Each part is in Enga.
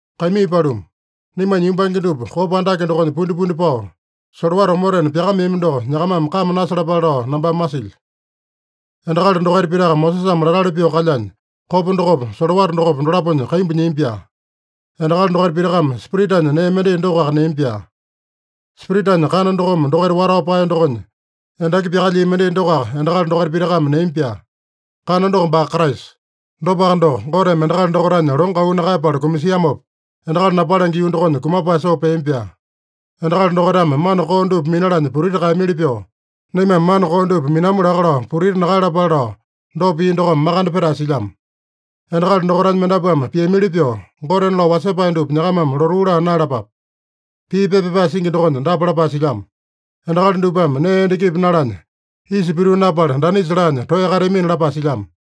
Kaimii paluma, naimanya yumbange dupa kopa andake dokonya pundipundi pao, solowata omotena pyakameami doko nyakamame kame nasalapale lao nambame masilyo. Endakali dokaita pitaka Mosesame latali pyoo kalyanya, kopa dokopa, solowata dokopa, dolaponya kaimbu nyiami-pyaa. Endakali dokaita pitakame Spiritanya nee mendai dokoaka neami-pyaa. Spiritanya kana dokome dokaita watao paeya dokonya endaki pyakalyia mendai dokoaka endakali dokaita pitakame neami-pyaa. Kana doko baa Kraisa. Dopaka doko, Goteme endakali dokaitanya longo auu nakaeyapala kumasiamopa, endakali napalenge yuu dokonya kumapae soo peami-pyaa. Endakali dokaitame mana koo dupa minalanya putiti kaeyamili pyoo, naimame mana koo dupa minamu laka lao putiti nakaeyalapale lao, dopa pia dokome makande petae silyamo. Endakali dokaitanya mendapuame piamili pyoo, gotena lao wasepae dupa nyakamame lotuu laa naeyalapape. Pii pepa pyapae singi dokonya dapa lapae silyamo: “Endakali dupame nee endakipi nalanya, isa pituu napala, danisa laanya toeya kateamina” lapae silyamo.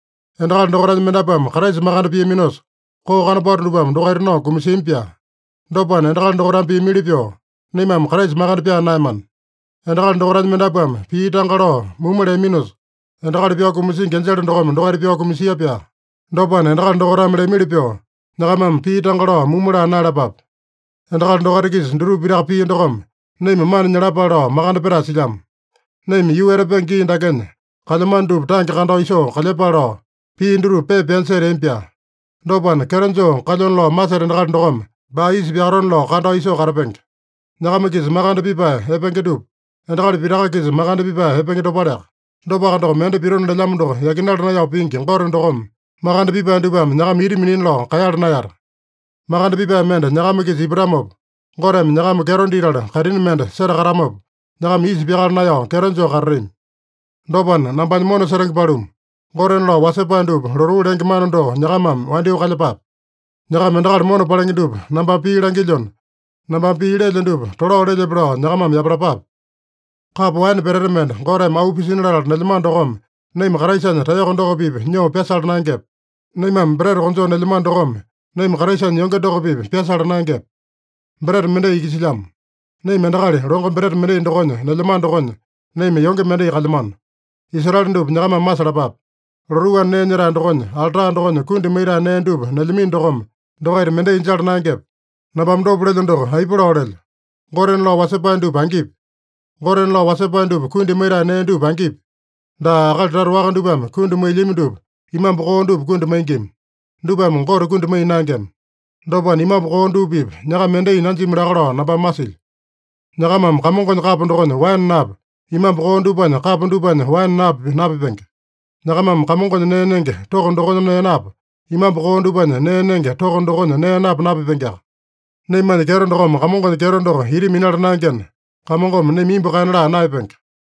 Endakali dokaitanya mendapuame Kraisa makande piaminosa, koo kanopato dupame dokaita nao kumasiami-pyaa. Dopana, endakali dokaitame piamili pyoo, naimame Kraisa makande pyaa naeyamana. Endakali dokaitanya mendapuame pii tanga lao mumu leaminosa, endakali pyao kumasingi enjele dokome dokaita pyao kumasia-pyaa. Dopana, endakali dokaitame leamili pyoo, nyakamame pii tanga lao mumu laa naeyalapape. Endakali dokaita-kisa dutupa pitaka pia dokome, naima mana nyalapale lao makande petae silyamo. Naima yuu etapenge gii dakenya kalyamano dupa tange kandao isoo kalyepale lao, pia dutupa pepa pyanya seteami-pyaa. Dopana, kyeto joo kalyona lao maseta endakali dokome baa isa pyakatone-lao kandao isoo katapenge. Nyakama-kisa makande pipae epenge dupa, endakali pitaka-kisa makande pipae epenge dopaleaka. Dopaka doko, mende pitona lelyamo doko yakinala naeyao pingi Gote dokome, makande pipae dupame nyakama ita minina lao kaeyala naeyata. Makande pipae mende nyakama-kisa ipatamopa, Goteme nyakama kyeto ditala kaitini mende setakatamopa, nyakama isa pyakala naeyao kyeto joo katatami. Dopana, nambanya mona setenge paluma, gotena lao wasepae dupa lotuu lenge mana doko nyakamame wandyoo kalyepape. Nyakama endakali mona palenge dupa nambame pii langilyona, nambame pii lelyo dupa tolao lelyepe lao nyakamame yapalapape. Kapo waene peteta mende Goteme auu pisina latala nelyamano dokome, naima Kraisanya taeyoko doko-pipa nyoo pyasala naengepe? Naimame breta konjoo nelyamano dokome, naima Kraisanya yonge doko-pipa pyasala naengepe? Breta mendai iki silyamo. Naima endakali longo breta mendai dokonya nelyamano dokonya, naima yonge mendai kalyamano. Israele dupa nyakamame masalapape: Lotuu anda nee nyetae dokonya alta dokonya kundi maitae nee dupa nelyamino dokome, dokaita mendai jala naengepe? Nambame dopa lelyo doko aipa lao lelyo? Gotena lao wasepae dupa angipi? Gotena lao wasepae dupa kundi maitae nee dupa angipi? Daa, akali tata waka dupame kundi mailyami dupa, imambu koo dupa kundi maingima. Dupame Gote kundi maiya naengema. Dopana, imambu koo dupa-pipa nyakama mendai nanjimi laka lao nambame masilyo. Nyakamame Kamongonya kapo dokonya waene napa, imambu koo dupanya kapo dupanya waene napa napipenge. Nyakamame Kamongonya nee nenge toko dokonya nee napa, imambu koo dupanya nee nenge toko dokonya nee napa napipengeaka. Naimanya kyeto dokome Kamongonya kyeto doko ita minala naengena, Kamongome naima imbu kaena laa naeyapenge.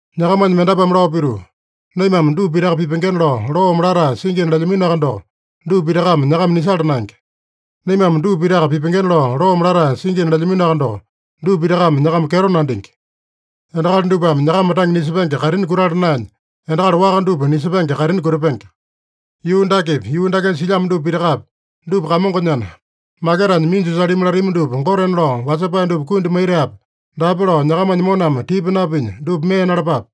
Nyakamanya mendapuame lao pituu, “Naimame dupa pitaka pipengena lao loome latae singina” lelyaminoaka doko, dupa pitakame nyakama nisala naenge. “Naimame dupa pitaka pipengena lao loome latae singina” lelyaminoaka doko, dupa pitakame nyakama kyeto nandingi. Endakali dupame nyakama tange nisepenge kaitini kutala naenya, endakali waka dupa nisepenge kaitini kutapenge. Yuu dakepi, yuu dakenya silyamo dupa pitakapi, dupa Kamongonyana, maketanya minju salimi latami dupa gotena lao wasepae dupa kundi maitaepe, daape lao nyakamanya moname tipa napinya, dupa mee nalapape.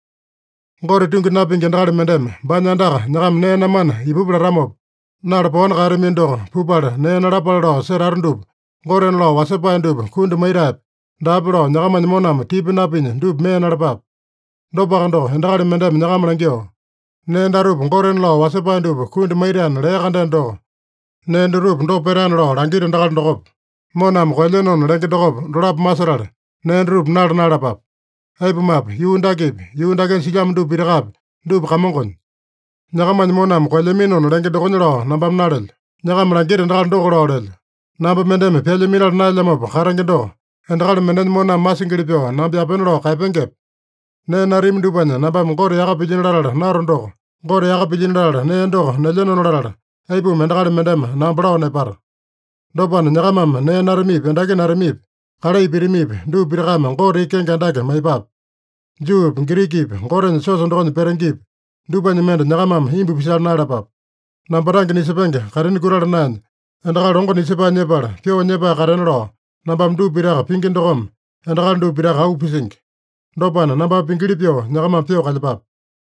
Gote tungi napingi endakali mendeme baanya andaka nyakama nee namana ipupa latamopa, nala paowani kaeyatamino doko, pupala nee nalapale lao setata dupa gotena lao wasepae dupa kundi maitaepe, daape lao nyakamanya moname tipa napinya, dupa mee nalapape. Dopaka doko, endakali mendeme nyakama langyoo, “Nee datupa gotena lao wasepae dupa kundi maitaena” lea-kandeno doko, nee dutupa dopa petaena lao langita endakali dokopa, moname koelyenona lenge dokopa, dolapo masetala nee dutupa nala naeyalapape. Aipumape, yuu dakepi, yuu dakenya silyamo dupa pitakapi, dupa Kamongonya. Nyakamanya moname koelyaminona lenge dokonya lao nambame nalelyo. Nyakama langita endakali doko lao lelyo. Namba mendeme pyalya minala naelyamopa katenge doko, endakali mendenya moname masingili pyoo namba yapena lao kaeyapengepe? Nee natami dupanya nambame Gote yaka pilyino latala nato doko, Gote yaka pilyino latala nee doko nelyenona latala, aipuma endakali mendeme namba lao nepata? Dopana, nyakamame nee natamipi, endaki natamipi, kalai pitamipi, dupa pitakame Gote iki kenge andake maiyepape. Juupi, Girikipi, Gotenya siosa dokonya petengepi, dupanya mende nyakamame imbu pisala naeyalapape. Namba tange nisepenge kaitini kutala naenya, endakali longo nisepae nyepala pyoo nyepae katena lao, nambame dupa pitaka pingi dokome, endakali dupa pitaka auu pisingi. Dopana, nambame pingili pyoo nyakamame pyoo kalyepape.